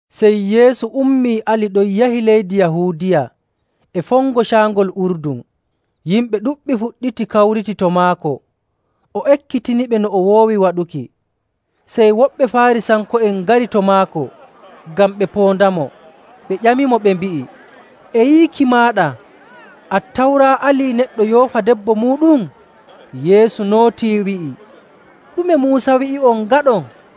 Sey Yeesu ummii ali ɗon yahi leydi Yahuudiya e fongo Caangol Urdun. Yimɓe ɗuɗɓe fuɗɗiti kawriti to maako, o ekkitiniɓe no o woowi waɗuki. Sey woɓɓe Faarisanko'en ngari to maako ngam ɓe poondamo, ɓe ƴamimo ɓe mbi'i, “E yiiki maaɗa Attawra alii neɗɗo yoofa debbo muuɗum?” Yeesu nootii wi'i, “Ɗume Muusa wi'i'on ngaɗon?”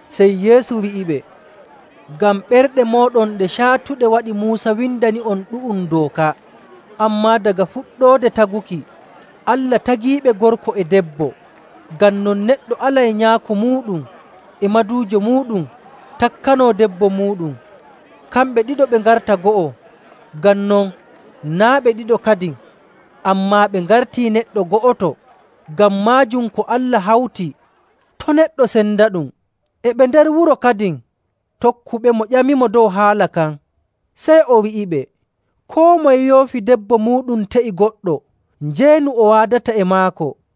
Sey Yeesu wi'iɓe, “Ngam ɓerɗe mooɗon ɗe caatuɗe waɗi Muusa windani'on ɗu'um dooka. Ammaa daga fuɗɗoode taguki ‘Allah tagiiɓe gorko e debbo.’. ‘Ngam non neɗɗo alay nyaako muuɗum e maduujo muuɗum takkanoo debbo muuɗum, kamɓe ɗiɗo ɓe ngarta go'o.’ Ngam non naa' ɓe ɗiɗo kadin, ammaa ɓe ngartii neɗɗo go'oto.. Ngam maajum ko Allah hawti, to' neɗɗo sendaɗum.” E ɓe nder wuro kadin, tokkuɓemo ƴamimo dow haala kan. Sey o wi'iɓe, “Koo moye yoofi debbo muuɗum te'i goɗɗo, njeenu o waadata e maako.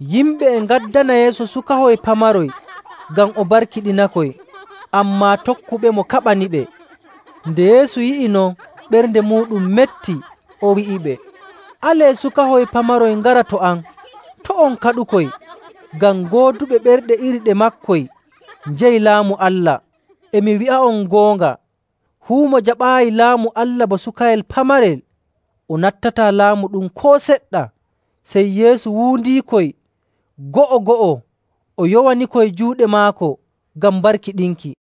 Yimɓe e ngaddana Yeesu sukahoy pamaroy ngam o barkiɗinakoy, ammaa tokkuɓemo kaɓaniɓe. Nde Yeesu yi'i non, ɓernde muuɗum metti, o wi'iɓe, “Alee sukahoy pamaroy ngara to am. To' on kaɗukoy, ngam gooduɓe ɓerɗe iri ɗe maakoy njeyi Laamu Allah. E mi wi'a'on goonga, fuu mo jaɓaayi Laamu Allah bo sukayel pamarel, o nattataa laamu ɗum koo seɗɗa!”. Sey Yeesu wuundiikoy go'o‑go'o, o yowanikoy juuɗe maako ngam barkiɗinki.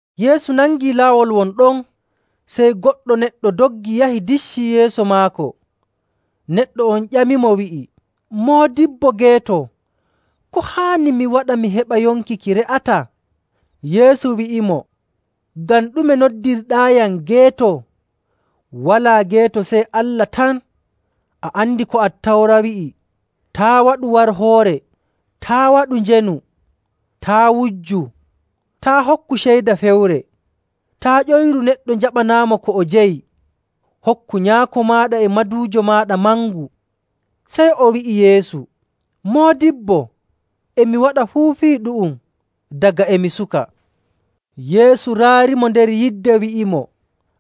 Yeesu nangi laawol won ɗon, sey goɗɗo neɗɗo doggi yahi diccii yeeso maako. Neɗɗo on ƴamimo, wi'i, “Moodibbo geeto, ko haani mi waɗa mi heɓa yonki ki re'ataa?” Yeesu wi'imo, “Ngam ɗume noddirɗaayam geeto? Walaa geeto sey Allah tan. A andi ko Attawra wi'i: ‘Taa' waɗu warhoore. Taa' waɗu njeenu. Taa' wujju. Taa' hokku ceyda fewre. Taa' ƴoyru neɗɗo njaɓanaamo ko o jeyi. Hokku nyaako maaɗa e maduujo maaɗa mangu.’”. Sey o wi'i Yeesu, “Moodibbo, e mi waɗa fuu fii ɗu'um daga e mi suka.” Yeesu raarimo nder yidde, wi'imo,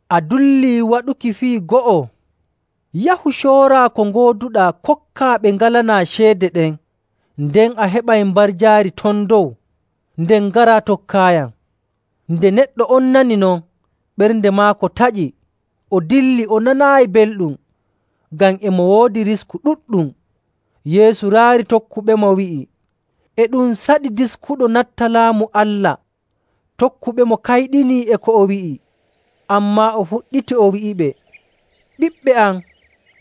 “A dullii waɗuki fii go'o. Yahu, cooraa ko ngooduɗaa, kokkaa ɓe ngalanaa ceede ɗen, nden a heɓay mbarjaari ton dow. Nden ngaraa, tokkaayam.” Nde neɗɗo on nani non, ɓernde maako taƴi, o dilli o nanaayi belɗum, ngam e mo woodi risku ɗuɗɗum. Yeesu raari tokkuɓemo wi'iɓe, “E ɗum saɗi diskuɗo natta Laamu Allah!” Tokkuɓemo kayɗinii e ko o wi'i, ammaa o fuɗɗiti o wi'iɓe, “Ɓiɓɓe am,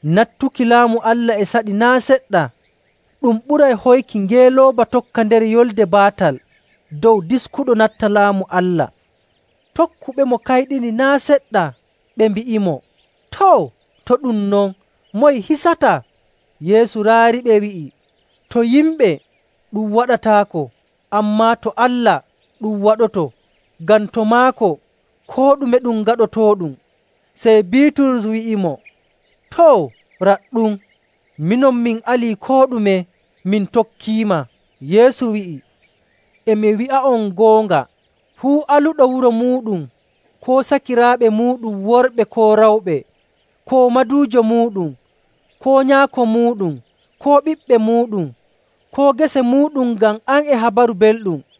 nattuki Laamu Allah e saɗi naa' seɗɗa! Ɗum ɓuray hoyki ngeelooba tokka nder yolnde baatal dow diskuɗo natta Laamu Allah.” Tokkuɓemo kayɗini naa' seɗɗa, ɓe mbi'imo, “Too, to ɗum non, moye hisata?” Yeesu raariɓe, wi'i, “To yimɓe ɗum waɗataako, ammaa to Allah ɗum waɗoto. Ngam to maako koo ɗume ɗum gaɗotooɗum.” Sey Biiturus wi'imo, “Too, raɗɗum, minon min alii koo ɗume min tokkiima.” Yeesu wi'i, “E mi wi'a'on goonga, fuu aluɗo wuro muuɗum, koo sakiraaɓe muuɗum worɓe koo rewɓe, koo maduujo muuɗum, koo nyaako muuɗum, koo ɓiɓɓe muuɗum, koo gese muuɗum ngam am e Habaru Belɗum,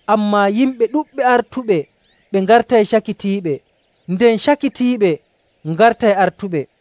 Ammaa yimɓe ɗuɗɓe artuɓe ɓe ngartay cakitiiɓe, nden cakitiiɓe ngartay artuɓe.”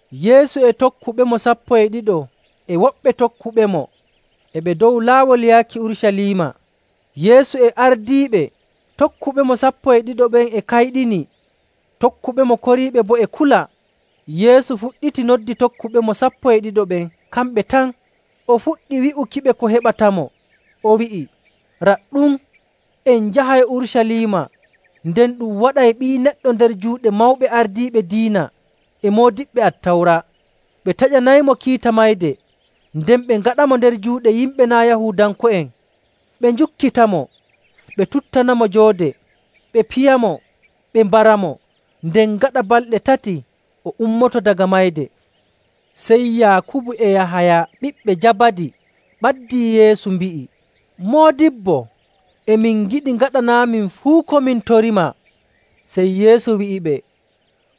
Yeesu e tokkuɓemo sappo e ɗiɗo e woɓɓe tokkuɓemo e ɓe dow laawol yaaki Urucaliima, Yeesu e ardiiɓe. Tokkuɓemo sappo e ɗiɗo ɓen e kayɗini, tokkuɓemo koriiɓe boo e kula. Yeesu fuɗɗiti noddi tokkuɓemo sappo e ɗiɗo ɓen kamɓe tan, o fuɗɗi wi'ukiɓe ko heɓatamo, o wi'i, “Raɗɗum, en njahay Urucaliima, nden ɗum waɗay Ɓii Neɗɗo nder juuɗe mawɓe ardiiɓe diina e moodiɓɓe Attawra. Ɓe taƴanaymo kiita mayde, nden ɓe ngaɗamo nder juuɗe yimɓe naa' Yahuudanko'en, ɓe njukkitamo, ɓe tuttanamo joode, ɓe piyamo, ɓe mbaramo. Nden gaɗa balɗe tati, o ummoto daga mayde.” Sey Yaakubu e Yahaya ɓiɓɓe Jabadi ɓaddii Yeesu, mbi'i, “Moodibbo, e min ngiɗi ngaɗanaamin fuu ko min torimaa.” Sey Yeesu wi'iɓe,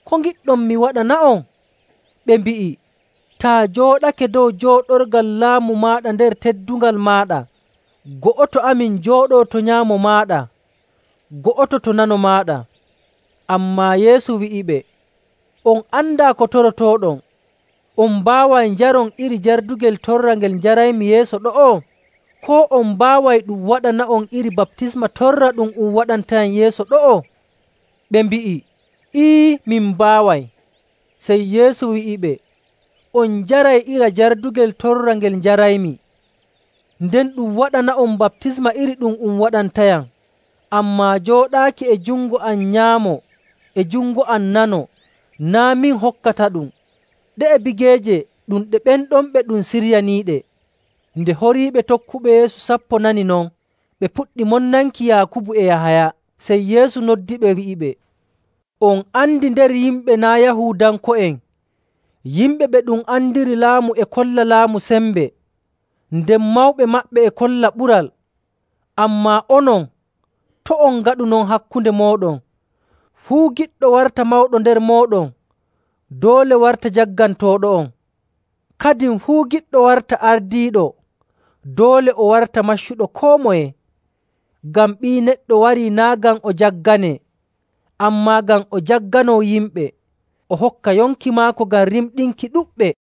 “Ko ngiɗɗon mi waɗana'on?” Ɓe mbi'i, “Taa jooɗake dow jooɗorgal laamu maaɗa nder teddungal maaɗa, go'oto amin jooɗoo to nyaamo maaɗa, go'oto to nano maaɗa.” Ammaa Yeesu wi'iɓe, “On andaa ko torotooɗon. On mbaaway njaron iri jardugel torra ngel njaraymi yeeso ɗo'o? Koo on mbaaway ɗum waɗana'on iri baptisma torra ɗum um waɗantayam yeeso ɗo'o?”. Ɓe mbi'i, “Ee, min mbaaway.” Sey Yeesu wi'iɓe, “On njaray iri jardugel torra ngel njaraymi, nden ɗum waɗana'on baptisma iri ɗum um waɗantayam. Ammaa jooɗaaki e jungo am nyaamo e jungo am nano naa' min hokkataɗum. Ɗe'e bigeeje ɗum ɗe ɓen ɗon ɓe ɗum siryaniiɗe.” Nde horiiɓe tokkuɓe Yeesu sappo nani non, ɓe puɗɗi monnanki Yaakubu e Yahaya. Sey Yeesu noddiɓe, wi'iɓe, “On andi nder yimɓe naa' Yahuudanko'en, yimɓe ɓe ɗum andiri laamu e kolla laamu sembe, nden mawɓe maɓɓe e kolla ɓural. Ammaa onon, to' on ngaɗu non hakkunde mooɗon. Fuu giɗɗo warta mawɗo nder mooɗon, doole warta jaggantooɗo'on.. Kadin fuu giɗɗo warta ardiiɗo, doole o warta maccuɗo koo moye.. Ngam Ɓii Neɗɗo warii naa' ngam o jagganee, ammaa ngam o jagganoo yimɓe, o hokka yonki maako ngam rimɗinki ɗuɗɓe.”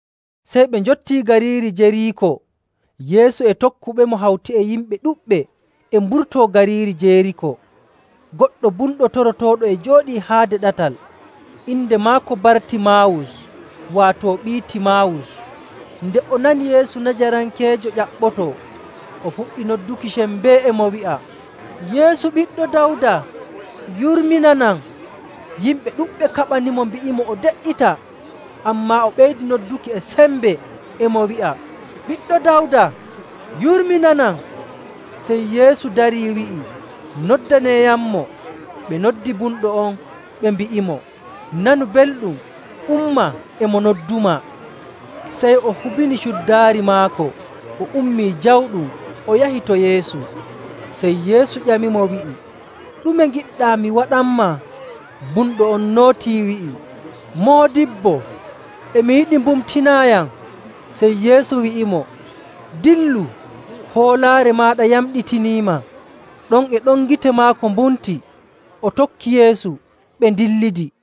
Sey ɓe njottii gariiri Jeriiko. Yeesu e tokkuɓemo hawti e yimɓe ɗuɗɓe e mburtoo gariiri Jeriiko, goɗɗo bumɗo torotooɗo e jooɗii haade ɗatal. Inde maako Bartimaawus, waato ɓii Timaawus. Nde o nani Yeesu Najarankeejo ƴaɓɓotoo, o fuɗɗi nodduki e sembe, e mo wi'a, “Yeesu, Ɓiɗɗo Dawda, yurminanam!” Yimɓe ɗuɗɓe kaɓanimo mbi'imo o de''ita, ammaa o ɓeydi nodduki e sembe, e mo wi'a, “Ɓiɗɗo Dawda, yurminanam!” Sey Yeesu darii, wi'i, “Noddaneeyammo.” Ɓe noddi bumɗo on, ɓe mbi'imo, “Nanu belɗum! Umma! E mo noddumaa.” Sey o hubini cuddaari maako, o ummii jawɗum, o yahi to Yeesu. Sey Yeesu ƴamimo, wi'i, “Ɗume ngiɗɗaa mi waɗanmaa?” Bumɗo on nootii wi'i, “Moodibbo, e mi yiɗi mbumtinaayam.” Sey Yeesu wi'imo, “Dillu. Hoolaare maaɗa yamɗitiniima.” Ɗon e ɗon gite maako mbumti, o tokki Yeesu, ɓe ndillidi.